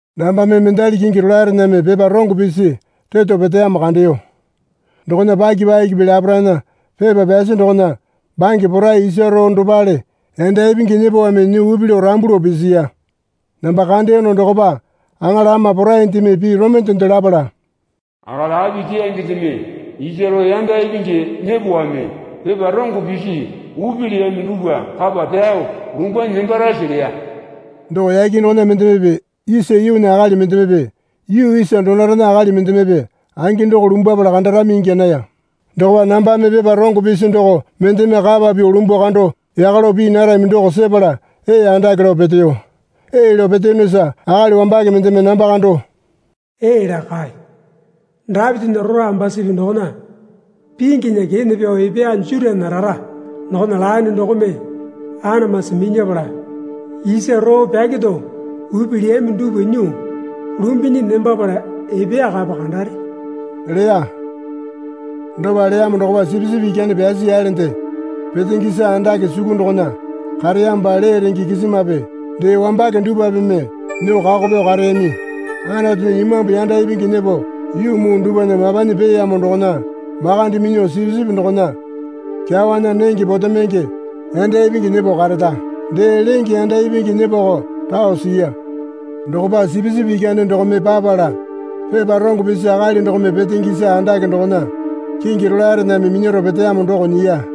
Nambame mendali kingi rolaerename pepa rongo pisi reto peteyamo kandeyo. Dokona paki pakipi laparaena pepa pyasi dokona bange porai isa roo dopale yanda ipingi nyepowame nyuo upi lao rambu lao pisiya. Namba kandeyono dokopa aŋala ama poraindeme pii romende lapala, Akali api keyangendeme isa roo yanda ipingi nyepowame pepa rongo pisi upi leyami dupwa kapa pyao lumbanyi nembarase? leya. Doko yake dokona mendemepe isa yuunya akali mendemepe yuu isa donorena akali mendemepe angi doko lumbwapala kandarami ingya naya. Dokopa nambame pepa rongo pisi doko mendeme kapa pyuo lumbuo kando yaka lao pii narami doko sepala ee andake lao peteyo. Ee lao peteyonosa akali wambake mendeme namba kando, Ee laa kae. Dapitinya rora ambusipi dokona pinginya kene pyao epeya Jutana rara dokona laene dokome anamasi minyapala isa roo pyakero upi leyami dupwa nyuo lumbunyi nembapala epeya kapa kandare leya. Dopa leyamo dokopa Sipisipi Ikyane pyasi yalende, petenge isa andake suku dokona kareyamopa lee renge kisimape dee wambake dupwapeme nyuo kako pyao kareyami. Anatunya imambu yanda ipingi nyepo yuu muu dupwana mapanyi peeyamo dokona makande minyuo Sipisipi dokona kyawana nenge potemenge yanda ipingi nyepo karara, dee lenge yanda ipingi nyepoko rao siya. Dokopa Sipisipi Ikyane dokome papala pepa rongo pisi akali dokome petenge isa andake dokona kingi rolaerename minyaro peteyamo doko nyiya.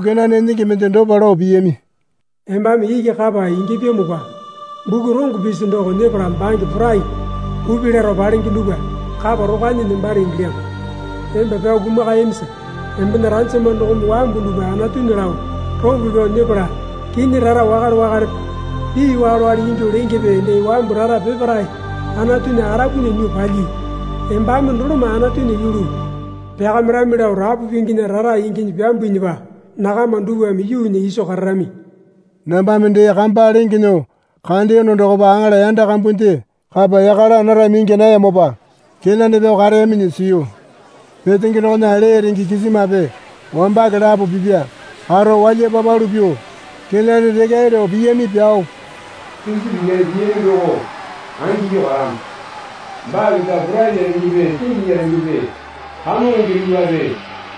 kenane enenge mende dopa lao piyami. Embame iki kapa ingyapyamopa buku rongo pisi doko nyepala bange porai upi laro palenge dupwa kapa rokwanyi nembare ingilyamo. Emba pyao kumakayamisa embena ranjama dokome wambu dupwa Anatunya lao ropo pyao nyepala kinyi rara wakale wakalepe pii wakale ingyuo lengepe dee wambu rara peparae Anatunya arapunya nyuo palyii. Embame doloma Anatunya yulu pyakamirami lao rapu pinginya rara inginyi pyambuinyipa nakama dupwame yuunya iso kararami. Nambame dee kamba lenge nyuo kandeyono dokopa aŋala yanda kambunde kapa yaka laa narami ingya nayamopa kenane pyao kareyaminyi siyu. Petenge dokona lee renge kisimape wambake lapo pipa karo walya papalu pyuo kenane rekyae lao piyami pyao, Sipisipi Ikyane piyami doko angingyuo karamo. Baa keta porainya rengepe singinya rengepe kamongonge dupwape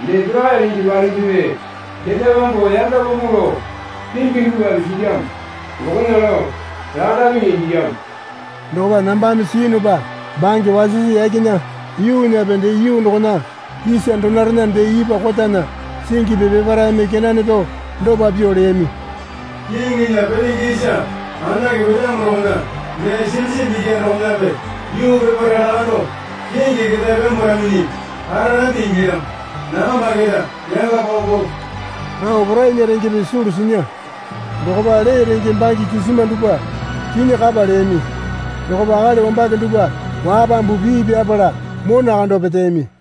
dee porakai renge palengepe ketae pyambuo yanga paupau lao pingi dupwape silyamo dokona lao lakandapenge ingilyamo. Dokopa nambame siyunupa bange wasisi yakena yuunyape dee yuu dokona isa donorena dee ipwa kotana singipi peparaeme kenane pyao dopa pyuo leyami. Kiŋinya petenge isa andake petamo dokona dee Sipisipi Ikyane dokonape yuu peparae lakandao kingi ketae pyambwaraminyi kararambi ingilyamo. Nakamba keta yanga paupau lao porainya rengepe sulu sinya. Dokopa lee renge bange kisima dupwa kinyi kapa leyami. Dokopa akali wambake dupwa wapambu pii pyapala mona kando peteyami.